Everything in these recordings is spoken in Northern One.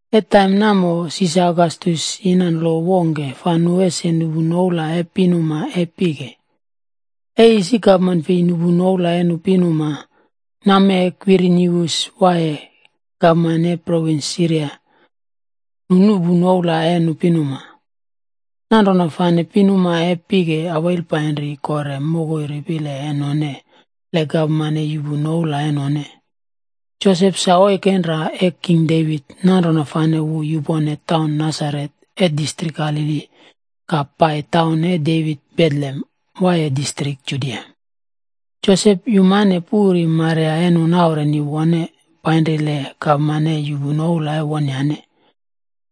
E taim namo, Sisar Ogastus yina lo wongke fa nu ese nuꞌpu noula e nu pinuma e pike. E isi gapman fei nuꞌpu noula e nu pinuma, nammee Kwirinius waiye gavana e provins Siria,a nu nuꞌpu noula e nu pinuma. Nanrona fane pinuma e pike awail painri kore mokoi ripile e none, le gapman e yuꞌpu noula e none. Josep sa ori oikenra e King Devit. Nanrona fane wu yupone taun Nasaret e distrik Galili, ka pai taun e Devit Betlehem, waiye distrik Judia. Josep yumane puri Maria e nu naureni wone, painri le gapman e yuꞌpu noula e wonyane.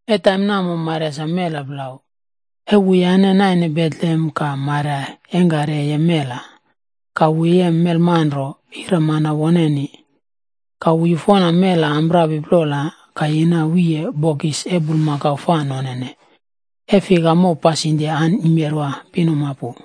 E taim namo Maria sa mela plau. E wuyane naine Betlehem ka Maria yeingkari e yem mela. Ka wu yem melmanro, ira mana woneni. Ka wu yufona mela amprapi plola, ka yina wiye bokis e bulmakau fa nonene, e fika mow pasindia sa yimerwa pinuma pu.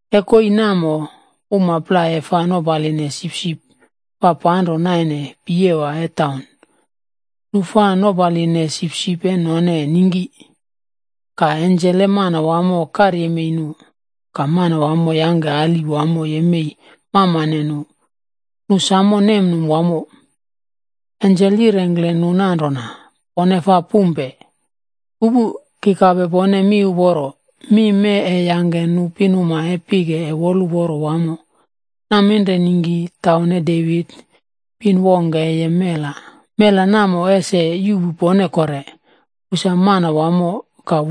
E koii namo, uma plai e fa nopaline sipsipb fa panro naine piyewa e taun, nu fa nopaline sipsip e none ningki. Ka ensel e Manawamo karyemei nu, ka Manawamo yangke ali wamo yemei mamane nu, nu sam nemnum wamo. Ensel yirengkle nu nanrona, “Pone fa pumpe. Pupu. Ki kape pone mi uporo, mi mee e yangke nu pinuma e pike e woluporo wamo. Naminre ningki taun e Devit, pin wongke e yem mela. Mela namo ese yuꞌpu pone kore. Wu sa Manawamo,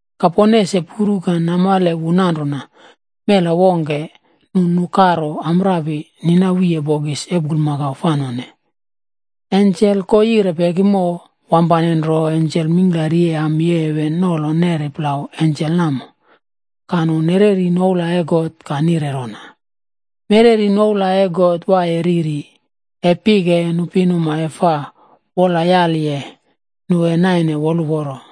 Ka pone ese puru ka namale wu nanrona. Mela wongke nu nukaro amprapi, nina wiye bokis e bulmakau fa none.” Ensel ko yire pekimo, wampane nro ensel e ami e heven mingklari wamo nolo neri plau ensel namo. Ka nu nereri noula e God ka nire rona: “Mereri noula e God Waiye Riri. E pike, nu pinuma e God fa wola yaliye, nu e naine wolraulo.”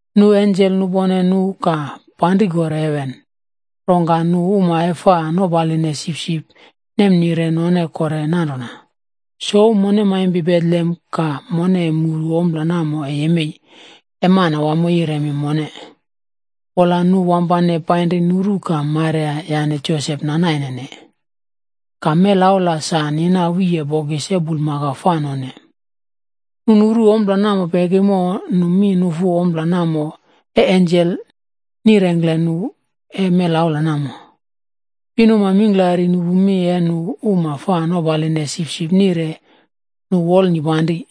Nu ensel nupone nu ka panri kore heven. Rongka nu uma e fa nopaline sipsip nemnire none kore nanrona, “Souw mone maimpi Betlehem ka mone muru ompla e yemeiye namo, e Manawamo yiremi mone.” Wola nu wampane painri nuru ka Maria yane Josep nanaine, ka melaula sa nina wiye bokis e bulmakau fa none. Nu nuru ompla namo pekimo, nu mi nufu ompla namo e ensel nirengkle nu e melaula namo. Pinuma mingklari nupu mi e nu uma fa nopaline sipsip noprone, nu wolnipanri.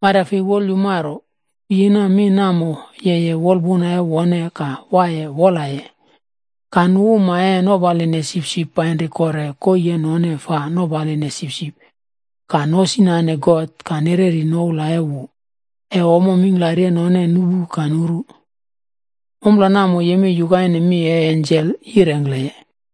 Maria fei wolyumaro, wu yina mi namo yeye wolpuna e wone ka waiye wolaye. Ka nu uma e nopaline sipsip painri kore koii e none fa nopaline sipsip ka nosinane God ka nereri noula e wu, e ommo mingklari e none nupu ka nuru. Ompla namo yemei yukaine mi e ensel yirengkleye.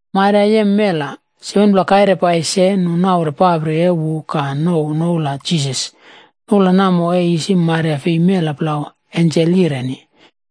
Maria yem mela, 7pla kaire pai se, nu naure papri e wu ka nouw noula Jisas. Noula namo e isi Maria fei mela plau, ensel yireni.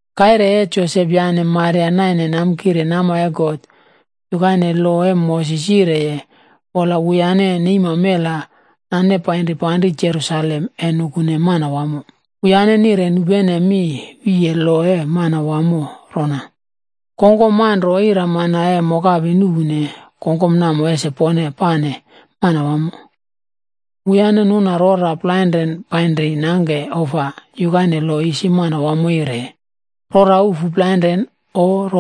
Kaire e Josep yane Maria naine namkire nama e God,d yukaine lo e Moses yireye, wola wuyane neima mela nane painri panri Jerusalem e nane mela pai Manawamo. Wuyane nire nupene mi wiye lo e Manawamo rona, “Kongkom manro ira mana e mokapi nuꞌpune, kongkom namo ese pone pane Manawamo.” Wuyane nuna rora plainren painri nangke ofa, yukaine lo isi Manawamo yireye, “Rora ufu plainren o,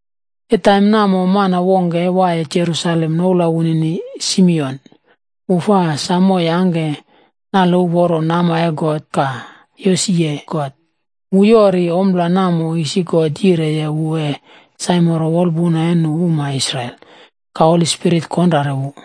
E taim namo mana wongke e waiye Jerusalem, noula wunini Simion. Wu fa samo yangke nale uporo nama e God ka yosiye God. Wu yori ompla namo isi God yireye wu e saimoro wolpuna e nu uma Israel. Ka Holi Spirit konrare wu.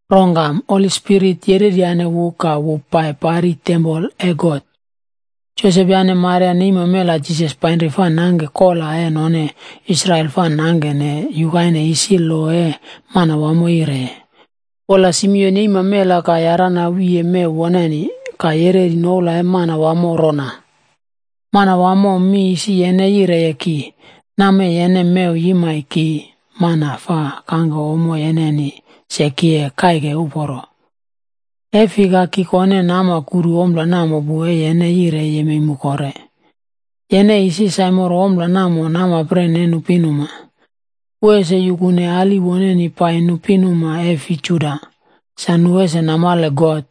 Rongka Holi Spirit yereryane wu ka wu pai pari tempol e God. Josep yane Maria neima mela Jisas painri fa nangke kola e none Israel fa nangkene yukaine isi lo e Manawamo yireye. Wola Simion yeima mela ka yarana wiye mew woneni. Ka yereri noula e Manawamo rona: “Manawamo mi isi yene yireye ki, nammee yene mew yimai ki mana fa kangke ommo yeneni se ki e kaiki woluporo. E fika ki kone nama kuru ompla namo pu, e yene yireye ese yuꞌpu mu kore. Yene isi saimoro ompla namo namapren e nu pinuma. Wu ese yukune ali woneni pai nu pinuma e fi Juda, sa nu ese namale God.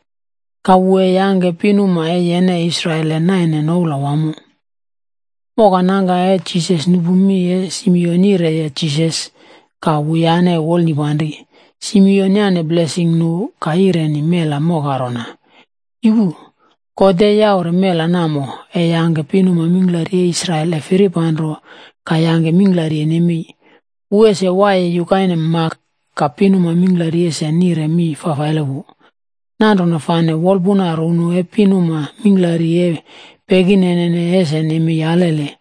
Ka wu e yangke pinuma e yene Israel ese nem noula wamo.” Moka nangka e Jisas nupu mi e Simion yireye Jisas, ka wuyane wolnipanri. Simion yane blesing nu, ka yireni mela moka rona, “Yupu. God e yaure mela namo, e yangke pinuma mingklari e Israel e firipanro, ka yangke mingklari e nemei kore. Wu ese waiye yukaine mak, ka pinuma mingklari ese nire mi fafaile wu. Nanrona fane wolpuna runu e pinuma mingklari e pekinene ese nemei alele.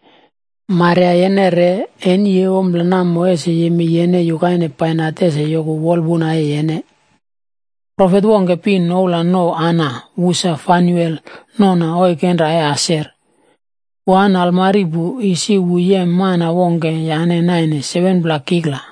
Maria yene re, eni e ompla namo ese yemei yene yukaine bainat ese yoku wolpuna e yene.” Profet wongke pin, noula nouw Ana. Wu sa Fanuel nona oikenra e Aser. Wu an almari pu. Isi wu yem mana wongke yane naine 7pla kikla.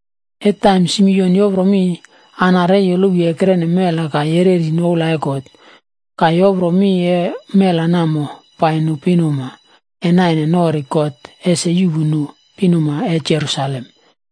E taim Simion yoproye mi, Ana re yolowi ekrene mela ka yereri noula e God. Ka yoprole mi e mela namo pai nu pinuma e naine norine God ese yuꞌpu nu pinuma e Jerusalem.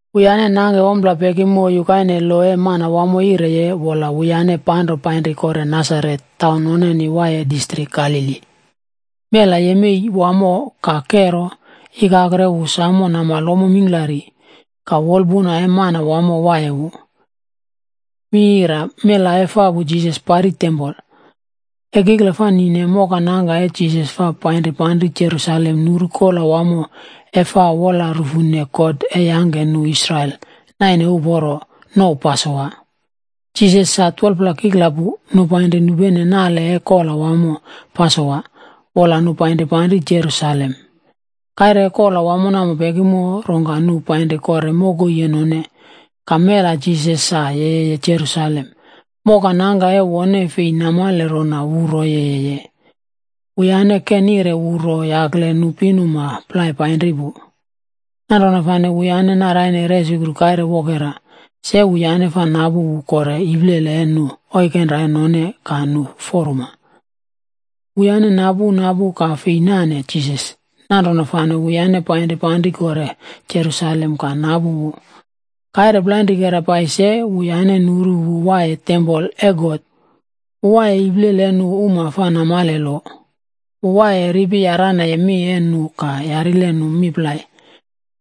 Wuyane nangke ompla pekimo yukaine lo e Manawamo yireye, wola wuyane panro painri kore Nasaret,f taun noneni waiye distrik Galili. Mela yemei wamo ka kero. Ikakro e wu samo namale ommo mingklari. Ka woluporo e Manawamo waiye wu. Mela efapu Jisas pari tempol. E kikla fa nine, mokanangka e Jisas fa painri panri Jerusalem nuru Kola Wamo e Fa Wola Rufune God e Yangke Nu Israel Naine Uporo, Jisas sa 12pla kikla pu, nu painri nupene nale e kola wamo Pasowa, wola nu painri panri Jerusalem. Kaire e kola wamo namo pekimo, rongka nu painri kore mokoi e none. Ka mela Jisas sa yeye Jerusalem. Moka nangka e wone fei namale rona wu ro yeye. Wuyane ke nire wu ro yakle nu pinuma plai painri pu. Nanrona fane wuyane naraine resukru kaire wokera. Se wuyane fa napu wu kore iplele e nu oikenra e none ka nu foruma. Wuyane napu, napu ka fei nane Jisas. Nanrona fane wuyane painri panri kore Jerusalem ka napu wu. Kaire plainrikera pai se, wuyane nuru wu waiye tempol e God. Wu waiye iplele e nu uma fa namale lo. Wu waiye ripi yaranaye mi e nu ka yarile nu mi plai.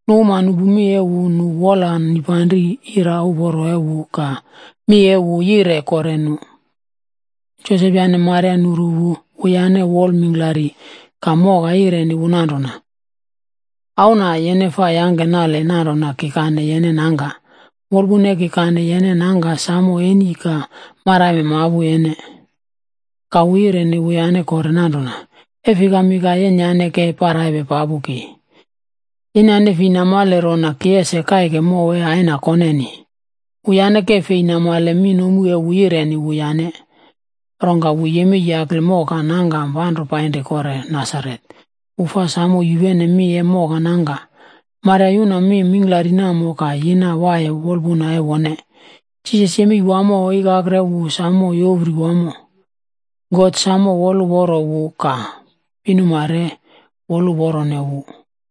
Nu uma nupu mi e wu, nu wola nipanri ira uporo e wu ka mi e wu yire kore nu. Josep yane Maria nuru wu, wuyane wol mingklari, ka moka yireni wu nanrona, “Auna, yene fa yangke nale nanrona ki kane yene nangka. Wolpuna e ki kane yene nangka samo eni ka maraime mapu yene.” Ka wu yireni wuyane kore nanrona, “E fikami ka yenyane ke paraipe papupe ki? Yenyane fei namale rona, ki es kaike mow e Aina koneni.” Wuyane ke fei namale mi nomu e wu yireniye wuyane. Rongka wu yemei yakle moka nangka panro painri kore Nasaret. Wu fa samo yupene mi e moka nangka. Maria yuna mi mingklari namo ka yina waiye wolpuna e wone. Jisas yemei wamo, ikakro e wu sam yopri wamo. God samo woluporo wu ka pinuma re woluporone wu.